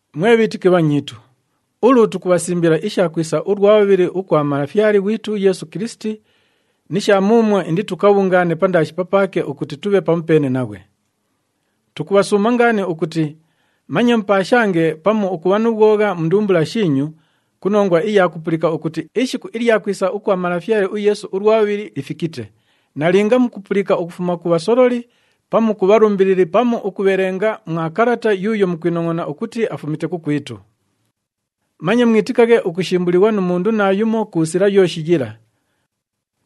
Mwe bhiitiki bhanyiitu, ulu tukubhasimbila isha kwisa ulwa bhubhili ukwa Malafyale ghwitu uYeesu Kilisiti ni sha muumwo inditukabhungaane pandaashi papaake ukuti tubhe pamupeene naghwe. Tukubhasuuma ngaani ukuti manye mupaashange pamu ukubha nu bhwogha mu ndumbula shiinyu ku nongwa iya kupulika ukuti ishiku ilya kwisa ukwa Malafyale uYeesu ulwa bhubhili lifikite, nalinga mukupulika ukufuma ku bhasololi pamu ku bhalumbilili pamu ukubhelenga mwa kalata yuuyo mukwinongʼona ukuti afumite kukwitu. Manye mwitikaghe ukushimbulighwa nu mundu naayumo ku sila yooshi yila.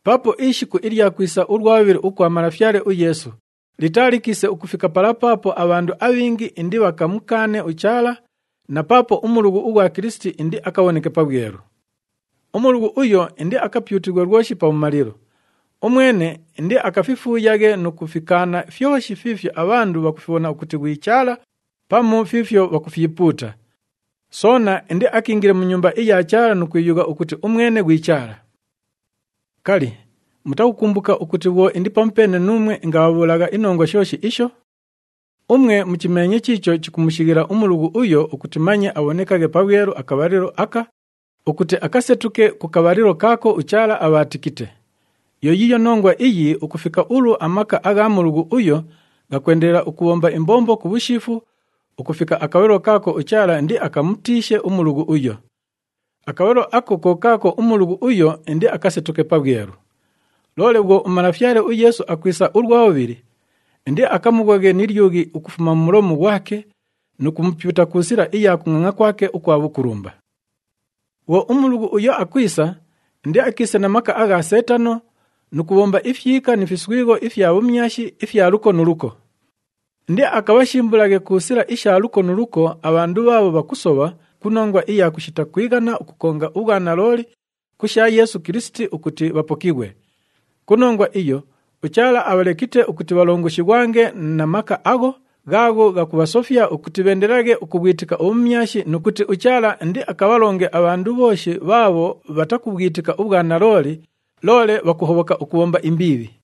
Paapo ishiku ilya kwisa ulwa bhubhili ukwa Malafyale uYeesu litaalikiise ukufika pala paapo abhandu abhingi indibhakamukaane uChaala na paapo uMulughu ughwa Kilisiti indiakabhoneke pabhwelu. UMulughu uyo indiakapyutighwe lwoshi pabhumalilo. Umwene indiakafifuuyaghe nu kufikaana fyoshi fiifyo abhandu bhakufibhona ukuti ghwi Chaala pamu fiifyo bhakufyipuuta. Soona indiakiingile mu Nyumba iya Chaala nu kwiyugha ukuti umwene ghwi Chaala. Kali, mutakukumbuka ukuti bhwo indi pamupeene nuumwe ingabhabhuulagha inongwa shooshi isho? Umwe muchimeenye chiicho chikumushighila uMulughu uyo ukuti manye abhonekaghe pabhwelu akabhalilo aka ukuti akasetuke ku kabhalilo kaako uChaala abhaatikite. Yo yiiyo nongwa iyi ukufika ulu amaka agha Mulughu uyo ghakwendelela ukubhomba imbombo ku bhushiifu ukufika akabhalilo kaako uChaala indiakamutiishe uMulughu uyo. Akabhalilo ako ko kaako uMulughu uyo indiakasetuke pabhwelu. Loole bhwo uMalafyale uYeesu akwisa ulwa bhubhili, indiakamughoghe ni lyughi ukufuma mu mulomu ghwake nu kumupyuta ku sila iya kungʼangʼa kwake ukwa bhukulumba. Bhwo uMulughu uyo akwisa, indiakiise na maka agha Seetano nu kubhomba ifyika ni fiswigho ifya bhumyashi ifya luko nu luko. Indiakabhashimbulaghe ku sila isha luko nu luko abhandu bhaabho bhakusobha ku nongwa iya kushita kwighana ukukonga ubhwanalooli ku sha Yeesu Kilisiti ukuti bhapokighwe. Ku nongwa iyo, uChaala abhalekite ukuti bhalongoshighwange na maka agho ghaagho ghakubhasofya ukuti bheendelelaghe ukubhwitika ubhumyashi nu kuti uChaala indiakabhalonge abhandu bhooshi bhaabho bhatakubhwitika ubhwanalooli, loole bhakuhobhoka ukubhomba imbiibhi.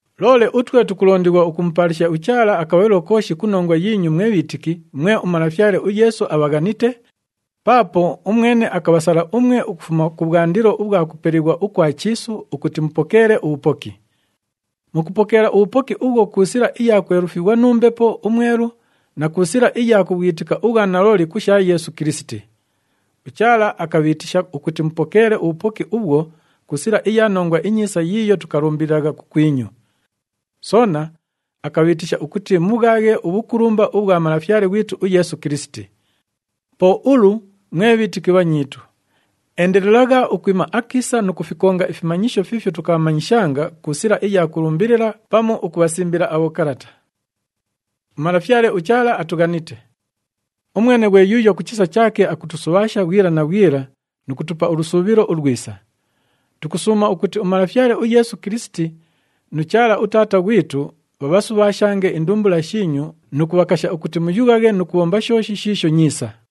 Loole utwe tukulondighwa ukumupaalisha uChaala akabhalilo kooshi ku nongwa yiinyu mwe bhiitiki mwe uMalafyale uYeesu abhaghanite, paapo umwene akabhasala umwe ukufuma kubhwandilo ubhwa kupelighwa ukwa chiisu ukuti mupokeele ubhupoki. Mukupokeela ubhupoki ubhwo ku sila iya kwelufighwa nu Mbepo uMwelu na ku sila iya kubhwitika ubhwanalooli ku sha Yeesu Kilisiti. UChaala akabhiitisha ukuti mupokeele ubhupoki ubhwo ku sila iya Nongwa iNyiisa yiiyo tukalumbililagha kukwinyu. Soona akabhiitisha ukuti mubhwaghe ubhukulumba ubhwa Malafyale ghwitu uYeesu Kilisiti. Po ulu, mwe bhiitiki bhanyiitu, endelelagha ukwima akiisa nu kufikonga ifimanyisho fiifyo tukabhamanyishanga ku sila iya kulumbilila pamu ukubhasimbila abhokalata. UMalafyale uChaala atughanite. Umwene ghwe yuuyo ku chisa chaake akutusubhaasha bhwila na bhwila nu kutupa ulusuubhilo ulwisa. Tukusuuma ukuti uMalafyale uYeesu Kilisiti nu Chaala uTaata ghwitu bhabhasubhaashange indumbula shiinyu nu kubhakasha ukuti muyughaghe nu kubhomba shooshi shiisho nyiisa.